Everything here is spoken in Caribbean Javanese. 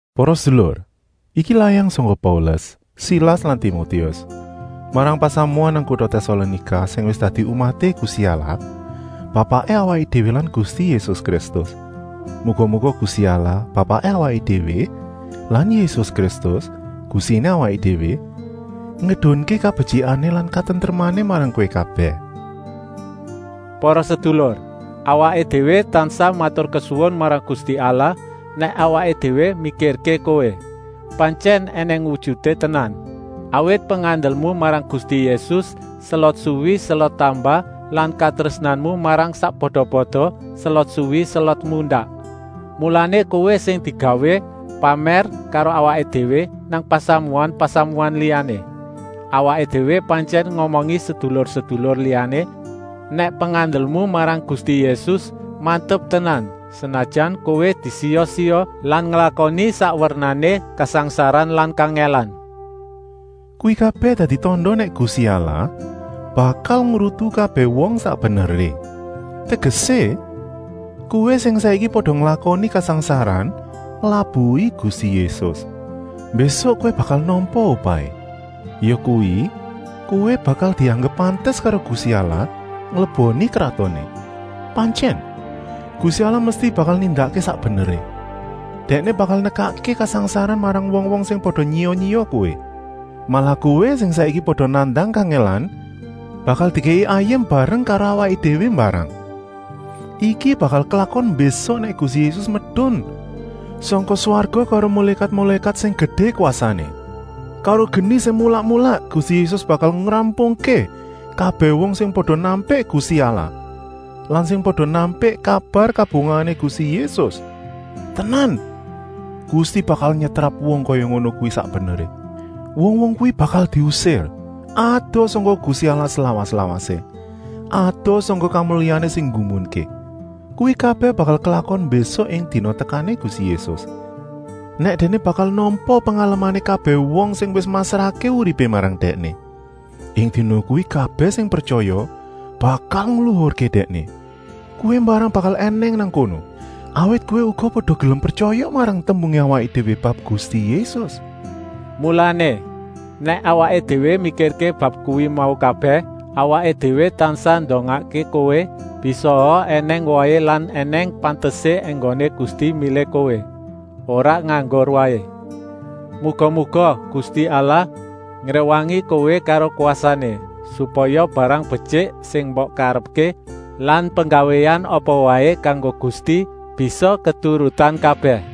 Para sedulur, iki layang sangka Paulus, Silas lan Timotius, marang pasamuan nang kuta Tèsalonika sing wis dadi umaté Gusti Allah Bapaké awaké déwé lan Gusti Yésus Kristus. Muga-muga Gusti Allah, Bapaké awaké déwé lan Yésus Kristus, Gustiné awaké déwé, ngedunké kabetyikané lan katentremané marang kowé kabèh. Para sedulur, awaké déwé tansah maturkesuwun marang Gusti Allah nèk awaké déwé mikirké kowé. Pantyèn ènèng wujuté tenan. Awit pengandelmu marang Gusti Yésus selot suwi selot tambah lan katrésnanmu marang sakpada-pada selot suwi selot mundak. Mulané kowé sing digawé pamèr karo awaké déwé nang pasamuan-pasamuan liyané. Awaké déwé pantyèn ngomongi sedulur-sedulur liyané nèk pengandelmu marang Gusti Yésus mantep tenan, senajan kowé disiya-siya lan nglakoni sak wernané kasangsaran lan kangèlan. Kuwi kabèh dadi tanda nèk Gusti Allah bakal ngrutu kabèh wong sak beneré. Tegesé, kowé sing saiki pada nglakoni kasangsaran nglabuhi Gusti Yésus, mbésuk kowé bakal nampa upahé, yakuwi, kowé bakal dianggep pantes karo Gusti Allah ngleboni kratoné. Pantyèn, Gusti Allah mesti bakal nindakké sak beneré, Dèkné bakal nekakké kasangsaran marang wong-wong sing pada nyiya-nyiya kowé. Malah kowé sing saiki pada nandang kangèlan bakal dikèki ayem bareng karo awaké déwé mbarang. Iki bakal klakon mbésuk nèk Gusti Yésus medun sangka swarga karo mulékat-mulékat sing gedé kwasané. Karo geni sing mulak-mulak Gusti Yésus bakal ngrampungké kabèh wong sing pada nampik Gusti Allah lan sing pada nampik kabar kabungahané Gusti Yésus. Tenan, Gusti bakal nyetrap wong kaya ngono kuwi sak beneré. Wong-wong kuwi bakal diusir, adoh sangka Gusti Allah slawas-lawasé, adoh sangka kamulyané sing nggumunké. Kuwi kabèh bakal klakon mbésuk ing dina tekané Gusti Yésus, nèk Dèkné bakal nampa pengalemané kabèh wong sing wis masrahké uripé marang Dèkné. Ing dina kuwi kabèh sing pretyaya bakal ngluhurké Dèkné. Kowé mbarang bakal ènèng nang kono, awit kowé uga pada gelem pretyaya marang tembungé awaké déwé bab Gusti Yésus. Mulané, nèk awaké déwé mikirké bab kuwi mau kabèh, awaké déwé tansah ndongakké kowé, bisaa ènèng wohé lan ènèng pantesé enggoné Gusti milih kowé, ora nganggur waé. Muga-muga Gusti Allah ngréwangi kowé karo kwasané, supaya barang betyik sing mbok karepké lan penggawéan apa waé kanggo Gusti bisa keturutan kabèh.